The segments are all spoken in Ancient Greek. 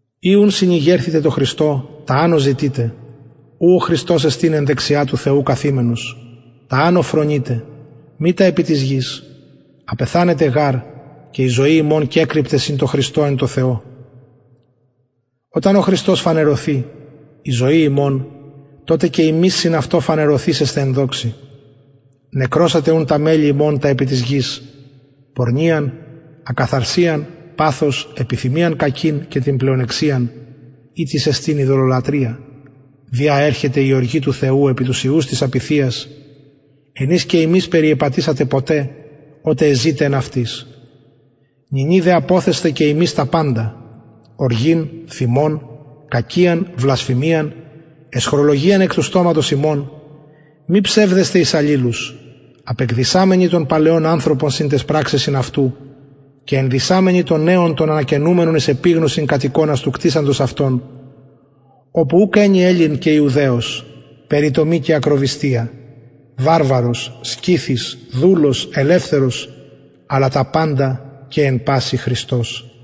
ει ουν συνηγερθητε τω χριστω τα ανω ζητειτε ου ο χριστος εστιν εν δεξια του θεου καθημενος τα ανω φρονειτε μη τα επι της γης απεθανετε γαρ και η ζωη υμων κεκρυπται συν τω χριστω εν τω θεω οταν ο χριστος φανερωθη η ζωη ημων τοτε και υμεις συν αυτω φανερωθησεσθε εν δοξη νεκρωσατε ουν τα μελη υμων τα επι της γης πορνειαν ακαθαρσιαν παθος επιθυμιαν κακην και την πλεονεξιαν ητις εστιν ειδωλολατρεια δι α ερχεται η οργη του θεου επι τους υιους της απειθειας εν οις και υμεις περιεπατησατε ποτε οτε εζητε εν αυτοις νυνι δε αποθεσθε και υμεις τα παντα οργην θυμον κακιαν βλασφημιαν αισχρολογιαν εκ του στοματος υμων μη ψευδεσθε εις αλληλους απεκδυσαμενοι τον παλαιον ανθρωπον συν ταις πραξεσιν αυτου και ενδυσαμενοι τον νεον τον ανακαινουμενον εις επιγνωσιν κατ εικονα του κτισαντος αυτον οπου ουκ ενι ελλην και ιουδαιος περιτομη και ακροβυστια βαρβαρος σκυθης δουλος ελευθερος αλλα τα παντα και εν πασιν χριστος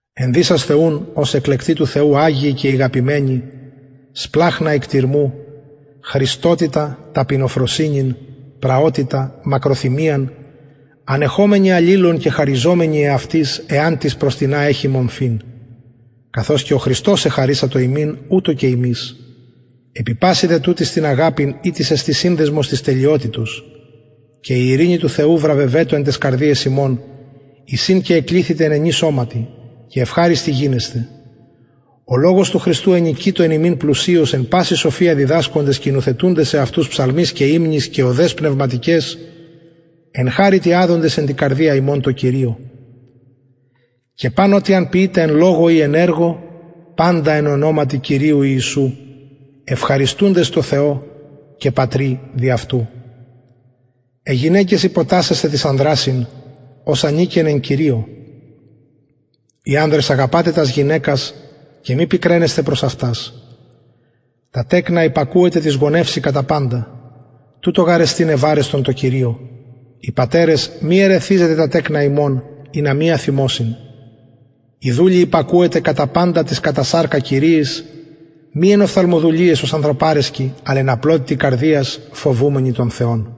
ενδυσασθε ουν ως εκλεκτοι του θεου αγιοι και ηγαπημενοι σπλαγχνα οικτιρμου χρηστοτητα ταπεινοφροσυνην πραοτητα μακροθυμιαν ανεχομενοι αλληλων και χαριζομενοι εαυτοις εαν τις προς τινα εχη μομφην καθως και ο χριστος εχαρισατο υμιν ουτως και υμεις επι πασιν δε τουτοις την αγαπην ητις εστιν συνδεσμος της τελειοτητος και η ειρηνη του θεου βραβευετω εν ταις καρδιαις υμων εις ην και εκληθητε εν ενι σωματι και ευχαριστοι γινεσθε ο λογος του χριστου ενοικειτω εν υμιν πλουσιως εν παση σοφια διδασκοντες και νουθετουντες εαυτους ψαλμοις και υμνοις και ωδαις πνευματικαις εν χαριτι αδοντες εν τη καρδια υμων τω κυριω και παν ο τι αν ποιητε εν λογω η εν εργω παντα εν ονοματι κυριου ιησου ευχαριστουντες τω θεω και πατρι δι αυτου αι γυναικες υποτασσεσθε τοις ιδιοις ανδρασιν ως ανηκεν εν κυριω οι ανδρες αγαπατε τας γυναικας και μη πικραινεσθε προς αυτας τα τεκνα υπακουετε τοις γονευσιν κατα παντα τουτο γαρ εστιν ευαρεστον εν κυριω οι πατερες μη ερεθιζετε τα τεκνα υμων ινα μη αθυμωσιν οι δουλοι υπακουετε κατα παντα τοις κατα σαρκα κυριοις μη εν οφθαλμοδουλειαις ως ανθρωπαρεσκοι αλλ εν απλοτητι καρδιας φοβουμενοι τον θεον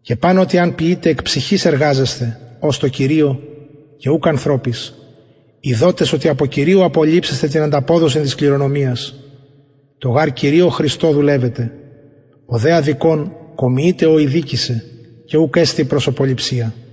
και παν ο τι εαν ποιητε εκ ψυχης εργαζεσθε ως τω κυριω και ουκ ανθρωποις ειδοτες οτι απο κυριου ληψεσθε την ανταποδοσιν της κληρονομιας τω γαρ κυριω χριστω δουλευετε ο δε αδικων κομιειται ο ηδικησεν και ουκ εστιν προσωποληψια